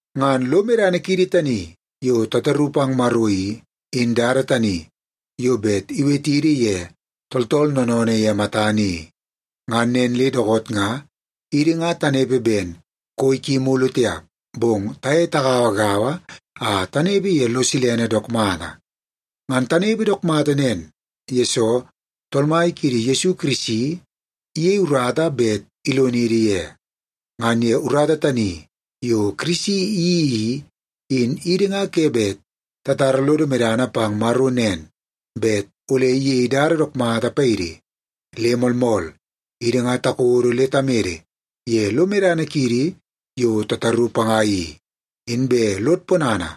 Ngan lo medana kiidi tani yo tataru pang Maro i, in dada tani yo bet iwetidi ye tooltool noonoonoo ye matana i. Ngan nen le dookoot nga idi ngan tanepe ben koi ki mulu tiap, bong taye tagauagaua a tanepe ye lo silene dook mata. Ngan tanepe dook mata nen, yesoo Tool Mai kiidi Yesu Kirisi, iyei urata bet ilonidi ye. Ngan ye urata tani yo Kirisi iyeii i, in idi nga ke bet tatara lodo medana pang Maro nen, bet ole iyei dada dook mata paidi. Le moolmool, idi nga takodo le tamede ye lo medana kiidi yo tataru panga i. Inbe lod ponana,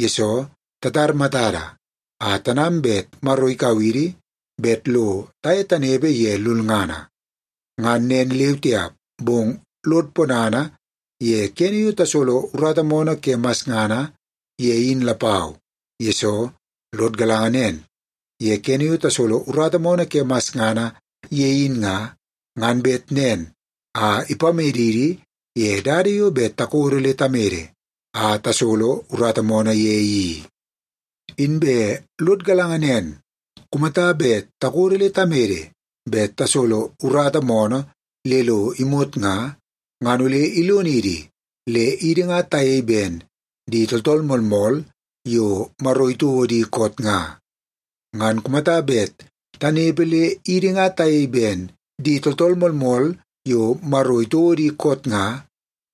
yesoo tatar matada a tanam bet Maro ikau idi bet lo taye tanepe ye lulngana. Ngan nen leu tiap, bong lod ponana ye kene yo tasolo urata moonoo ke masngana ye in lapau. Yesoo, lod galanga nen, ye kene yo tasolo urata moonoo ke masngana ye in nga, ngan bet nen a ipamedidi ye dada yo bet takodo le tamede a tasolo urata moonoo ye i. Inbe lod galanga nen, kumata bet takodo le tamede bet tasolo urata moonoo le lo imot nga, ngan ole ilonidi le idi nga tayei ben di tooltool moolmool yo Maro itouo di koot nga. Ngan kumata bet tanepe le idi nga tayei ben di tooltool moolmool yo Maro itouo di koot nga,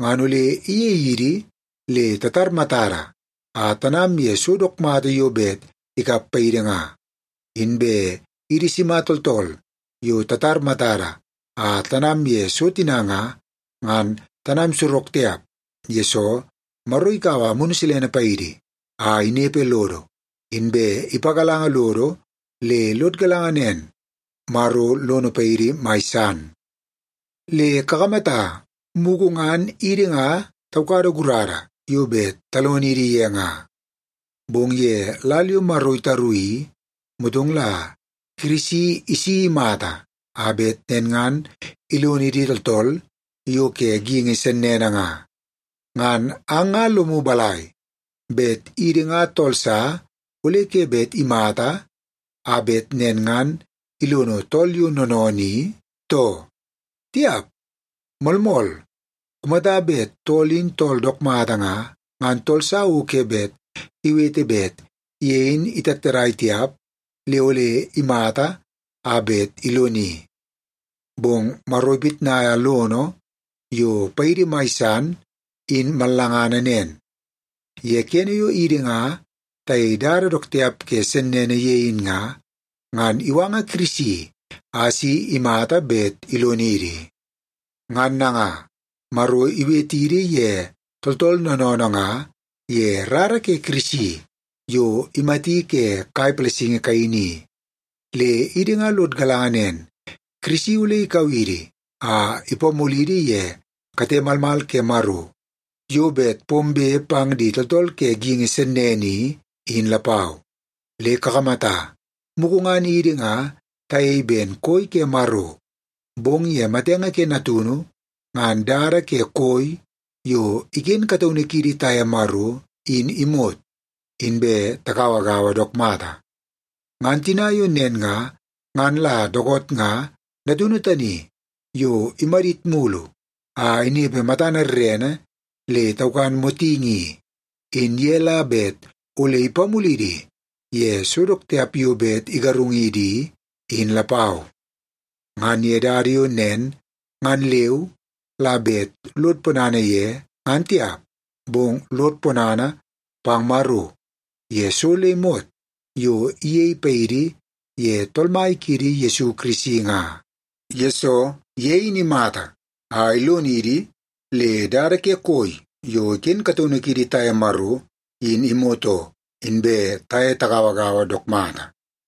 ngan ole iyei idi le tatar matada a tanam ye so dook mata yo bet ikap paidi nga. Inbe idi sima tooltool yo tatar matada a tanam ye so tina nga, ngan tanam sorok tiap, yesoo Maro ikaua Amunu Silene paidi a inepe lodo. Inbe ipagalanga lodo le lod galanga nen, Maro lono paidi mai san. Le kakamata, mugu ngan idi nga taukada gurana yo bet talonidi ye nga. Bong ye lal yo Maro itaru i, motong la Kirisi isi imata a bet nen ngan ilonidi tooltool yo ke geingi sennene nga. Ngan ang nga lomu balai, bet idi nga tool sa ole ke bet imata a bet nen ngan ilono tool yo noonoonoo i, too? Tiap! Moolmool, kumata bet tool in tool dook mata nga, ngan tool sa o ke bet iwete bet ye in itattadai tiap le ole imata a bet iloni. Bong Maro ipitnaia lono yo paidi mai san, in mallangana nen. Ye kene yo idi nga tayei dada dook tiap ke sennene ye in nga, ngan iwanga Kirisi a si imata bet ilonidi. Ngan nanga, Maro iwetidi ye tooltool noonoonoo nga ye rara ke Kirisi yo imati ke kai palasingi kaini i. Le idi nga lod galanga nen, Kirisi ole ikau idi a ipamulidi ye kate malmal ke Maro yo bet pombe pang di tooltool ke geingi sennene i, in lapau. Le kakamata, mugu ngan idi nga tayei ben koi ke Maro, bong ye matenge ke Natunu, ngan dada ke koi yo iken kataunu kiidi taye Maro in imot, inbe tagauagaua dook mata. Ngan tina yo nen nga, ngan la dookoot nga Natunu tani yo imadit mulu a inepe matana rerene le taukan motingi i, in ye la bet ole ipamulidi ye so dook tiap yo bet igarungidi i, in lapau. Ngan ye dada yo nen ngan leu la bet lod ponana ye, ngan tiap, bong lod ponana pang Maro ye so le imot yo iyei paidi ye Tool Mai kiidi Yesu Kirisi nga. Yesoo, ye in imata a ilonidi le dada ke koi yo iken kataunu kiidi taye Maro in imot oo, inbe taye tagauagaua dook mata.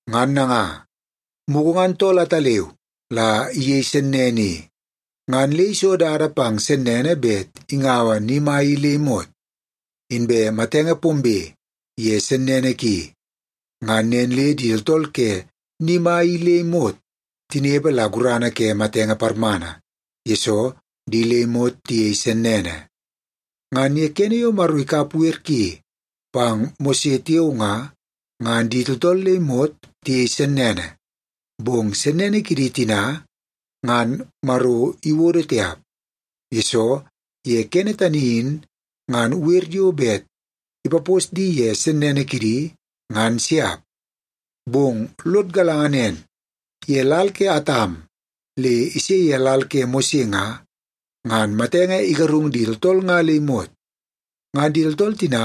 Ngan nanga, mugu ngan tool ataleu la iyei sennene i, ngan le iso dada pang sennene bet ingaua ni mai i le imot. Inbe matenge pombe ye sennene ki, ngan nen le di tooltool ke ni mai i le imot tinepe la gurana ke matenge parmana, yesoo di le imot tiyei sennene. Ngan ye kene yo Maro ikap wer ki pang Mose tiao nga, ngan di tooltool le imot tiyei sennene. Bong sennene kidi tina ngan Maro iwodo tiap, yesoo ye kene tani in ngan wer yo bet ipapos di ye sennene kidi, ngan siap. Bong lod galanga nen, ye lal ke Atam le ise ye lal ke Mose nga, ngan matenge igarung di tooltool nga le imot. Ngan di tooltool tina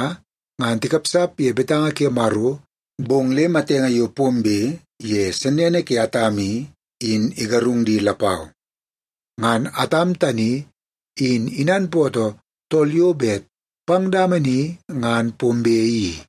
ngan tikapsap ye betanga ke Maro dawa ben Atam, in tiap, bong le matenge yo pombe ye sennene ke Atam i, in igarung di lapau. Ngan Atam tani in inanpootoo tool yo bet pang dama ni ngan pombe i.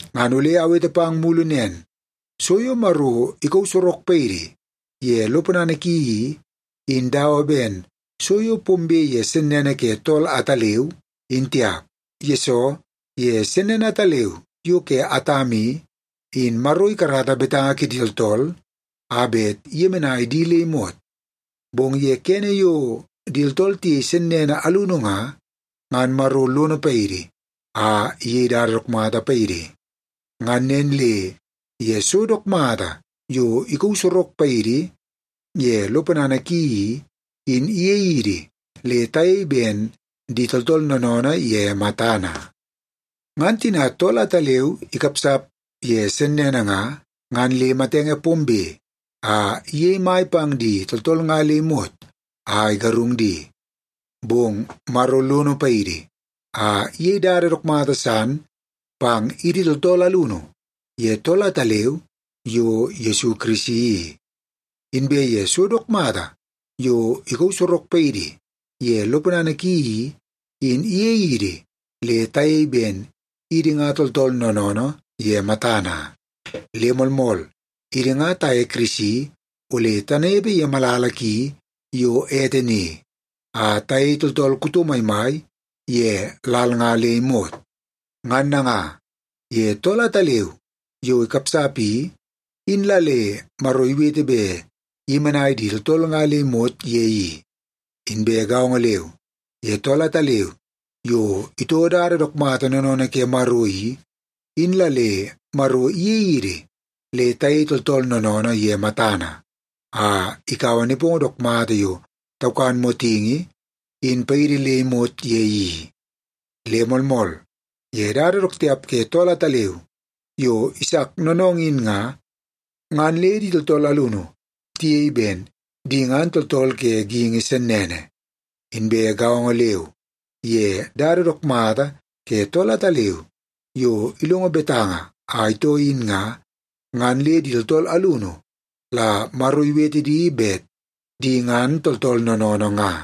Ngan ole awete pang mulu nen, so yo Maro ikauu sorok paidi ye lo ponana ki i, in dawa ben so yo pombe ye sennene ke tool ataleu, in tiap. Yesoo, ye sennene ataleu yo ke Atam i, in Maro ikarata betanga kidi tooltool a bet iyemenai di le imot. Bong ye kene yo di tooltool tiyei sennene alunu nga, ngan Maro lono paidi a iyei dada dook mata paidi. Ngan nen le ye so dook mata yo ikauu sorok paidi ye lo ponana ki i, in iyei idi le tayei ben di tooltool noonoonoo ye matana. Ngan tina tool ataleu ikapsap ye sennene nga, ngan le matenge pombe a iyei mai pang di tooltool nga le imot a igarung di. Bong Maro lono paidi a iyei dada dook mata san pang idi tooltool alunu ye tool ataleu yo Yesu Kirisi i. Inbe ye so dook mata yo ikauu sorok paidi ye lo ponana ki i, in iyei idi le tayei ben idi nga tooltool noonoonoo ye matana. Le moolmool, idi nga taye Kirisi ole tanepe ye malala ki yo ete ni, a tayei tooltool kuto maimai ye lal nga le imot. Ngan nanga, ye tool ataleu yo ikapsap i, in la le Maro iwete bet iyemenai di tooltool nga le imot ye i. Inbe gaongo leu, ye tool ataleu yo itoo dada dook mata noonoonoo ke Maro i, in la le Maro iyei idi le tayei tooltool noonoonoo ye matana, a ikaua nepongo dook mata yo taukan motingi, in paidi le imot ye i. Le moolmool, ye dada dook tiap ke tool ataleu yo isak noonoongoo in nga, ngan le di tooltool alunu tiyei ben di ngan tooltool ke geingi sennene. Inbe gaongo leu, ye dada dook mata ke tool ataleu yo ilongo betanga a itoo in nga, ngan le di tooltool alunu la Maro iwete di bet di ngan tooltool noonoonoo nga.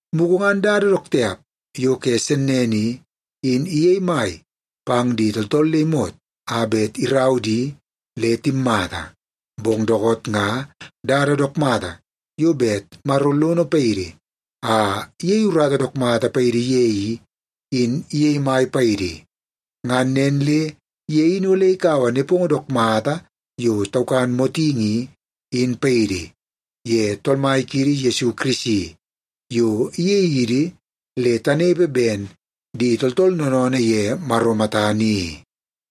Mugu ngan dada dook tiap yo ke sennene i, in iyei mai pang di tooltool le imot a bet irau di le timmata. Bong dookoot nga dada dook mata yo bet Maro lono paidi a iyei urata dook mata paidi ye i, in iyei mai paidi. Ngan nen le ye in ole ikaua nepongo dook mata yo taukan motingi i, in paidi, ye Tool Mai kiidi Yesu Kirisi, yo iyei idi le tanepe ben di tooltool noonoonoo ye Maro matana i.